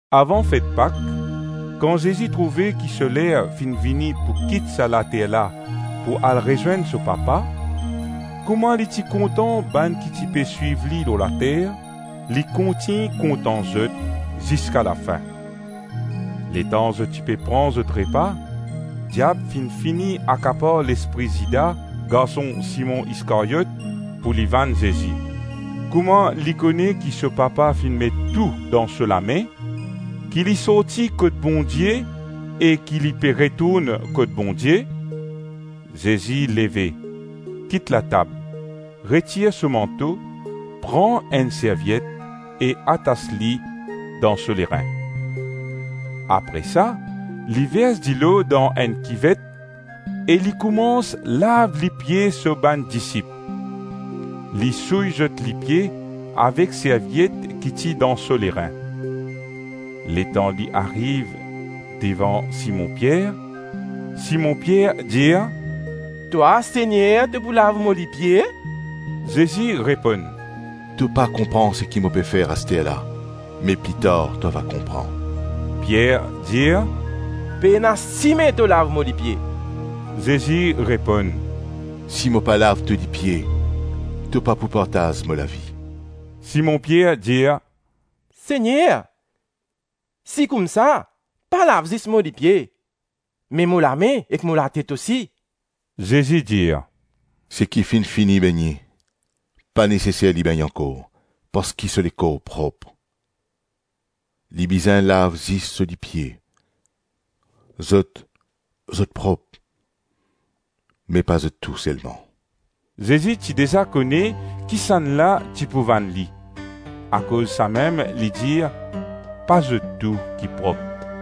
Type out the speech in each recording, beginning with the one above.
Avan fet Pak, kan Zezi trouve ki so ler finn vini pou kit sa later la pou al rezwenn so Papa, kouma li ti kontan bann ki ti pe swiv li lor later, li kontign kontan zot ziska lafin. Letan zot ti pe pran zot repa, diab finn fini akapar lespri Zida, garson Simon Iskaryot, pou li vann Zezi. Kouma li kone ki so Papa finn met tou dan so lame, ki li sorti kot Bondie e ki li pe retourn kot Bondie, Zezi leve, kit latab, retir so manto, pran enn serviet e atas li dan so lerin. Apre sa, li vers dilo dan enn kivet e li koumans lav lipie so bann disip; li souy zot lipie avek serviet ki ti dan so lerin. Letan li ariv devan Simon Pier, Simon Pier dir, “Twa, Segner, to pou lav mo lipie?” Zezi reponn, “To pa konpran seki mo pe fer asterla me pli tar to ava konpran.” Pier dir, “Pena sime to lav mo lipie.” Zezi reponn, “Si mo pa lav to lipie to pa pou partaz mo lavi.” Simon Pier dir, “Segner, si koumsa, pa lav zis mo lipie me mo lame ek mo latet osi.” Zezi dir, “Seki finn fini begne, pa neseser li begne ankor parski so lekor prop; li bizin lav zis so lipie. Zot, zot prop me pa zot tou selman.” (Zezi ti deza kone kisannla ti pou vann li; akoz samem li dir, ‘Pa zot tou ki prop.’)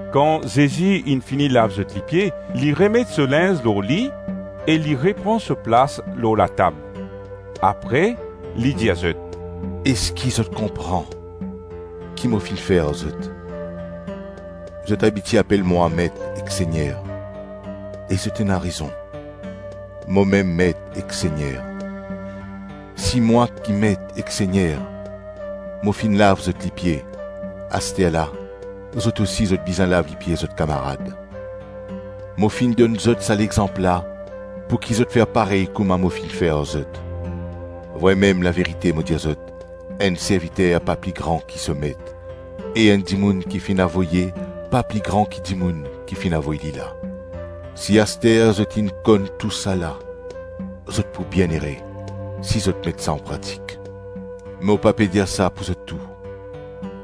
Kan Zezi inn fini lav zot lipie, li remet so linz lor li e li repran so plas lor latab; apre li dir zot, “Eski zot konpran ki mo finn fer ar zot? Zot abitie apel mwa ‘Met ek Segner.’ E zot ena rezon. Momem Met ek Segner. Si mwa ki Met ek Segner, mo finn lav zot lipie, asterla, zot osi zot bizin lav lipie zot kamarad. Mo finn donn zot sa lexanp la pouki zot fer parey kouma mo finn fer ar zot. Vremem, laverite mo dir zot, enn serviter pa pli gran ki so met e enn dimoun ki finn avoye pa pli gran ki dimoun ki finn avoy li la. Si aster zot inn konn tousala, zot pou bienere si zot met sa anpratik. Mo pa pe dir sa pou zot tou;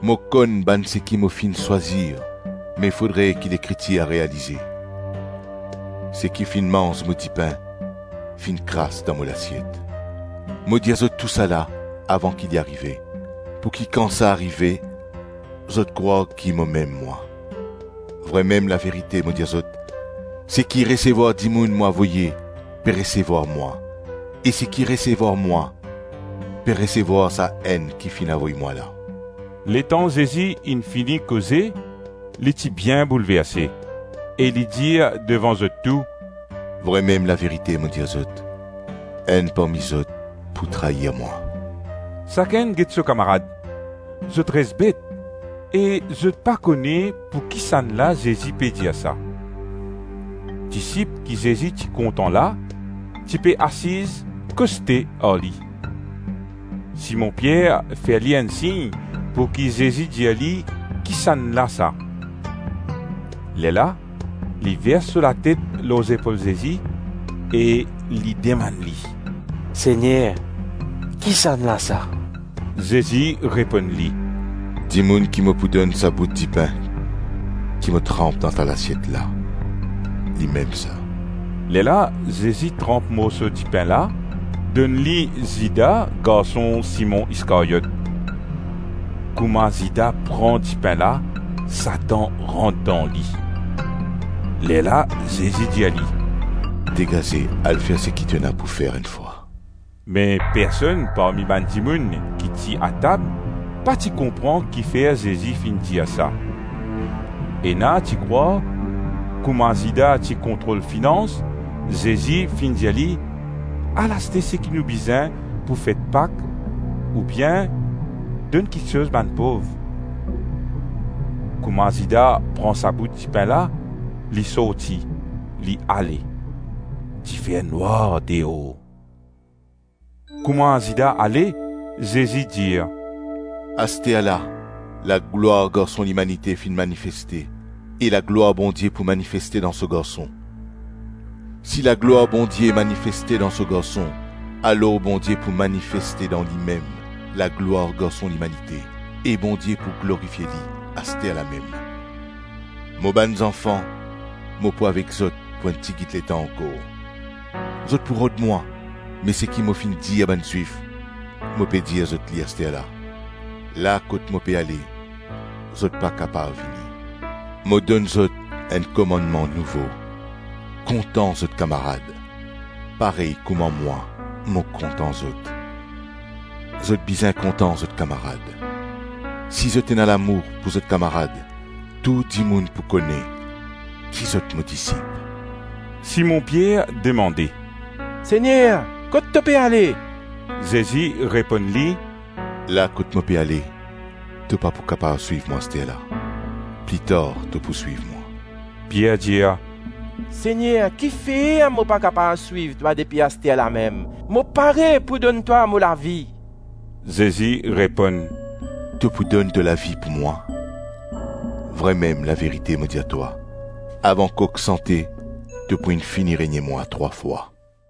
mo konn bann seki mo finn swazir me fodre ki Lekritir realize, ‘Seki finn manz mo dipin, finn kras dan mo lasiet.’ Mo dir zot tousala avan ki li arive, pouki kan sa arive, zot krwar ki Mo-Mem-Mwa. Vremem, laverite mo dir zot, seki resevwar dimoun mo avoye, pe resevwar mwa e seki resevwar mwa, pe resevwar Sa-Enn ki finn avoy mwa la.” Letan Zezi inn fini koze, li ti bien boulverse e li dir devan zot tou, “Vremem, laverite mo dir zot, enn parmi zot pou trair mwa.” Sakenn get so kamarad; zot res bet e zot pa kone pouki sannla Zezi pe dir sa. Disip ki Zezi ti kontan la, ti pe asiz koste ar li. Simon Pier fer li enn sign pouki Zezi dir li kisannla sa. Lerla li vers so latet lor zepol Zezi e li demann li, “Segner, kisannla sa?” Zezi reponn li, “Dimoun ki mo pou donn sa bout dipin ki mo tranp dan sa lasiet la, limem sa.” Lerla Zezi tranp morso dipin la, donn li Zida garson Simon Iskaryot. Kouma Zida pran dipin la, Satan rant dan li. Lerla Zezi dir li, “Degaze al fer seki to ena pou fer enn fwa.” Me personn parmi bann dimoun ki ti atab, pa ti konpran ki fer Zezi finn dir sa. Ena ti krwar, kouma Zida ti kontrol finans, Zezi finn dir li, ‘Al aste seki nou bizin pou fet Pak ou bien donn kiksoz bann pov.’ Kouma Zida pran sa bout dipin la, li sorti, li ale. Ti fer nwar deor. Kouma Zida ale, Zezi dir, “Asterla laglwar Garson Limanite finn manifeste e laglwar Bondie pou manifeste dan so Garson. Si laglwar Bondie manifeste dan so Garson, alors Bondie pou manifeste dan limem laglwar Garson Limanite e Bondie pou glorifie li asterlamem. Mo bann zanfan, mo pou avek zot pou enn tigit letan ankor; zot pou rod mwa me seki mo finn dir bann Zwif, mo pe dir zot li asterla, ‘La kot mo pe ale, zot pa kapav vini.’ Mo donn zot enn komannman nouvo: kontan zot kamarad, parey kouma mwa, mo kontan zot. Zot bizin kontan zot kamarad. Si zot ena lamour pou zot kamarad, tou dimoun pou kone ki zot mo disip.” Simon Pier demande, “Segner, kot to pe ale?” Zezi reponn li, “La kot mo pe ale, to pa pou kapav swiv mwa asterla, pli tar to pou swiv mwa.” Pier dir, “Segner, ki fer mo pa kapav swiv twa depi asterlamem? Mo pare pou donn twa mo lavi.” Zezi reponn, “To pou donn to lavi pou mwa? Vremem, laverite mo dir twa, avan kok sante to pou inn fini renie mwa trwa fwa.”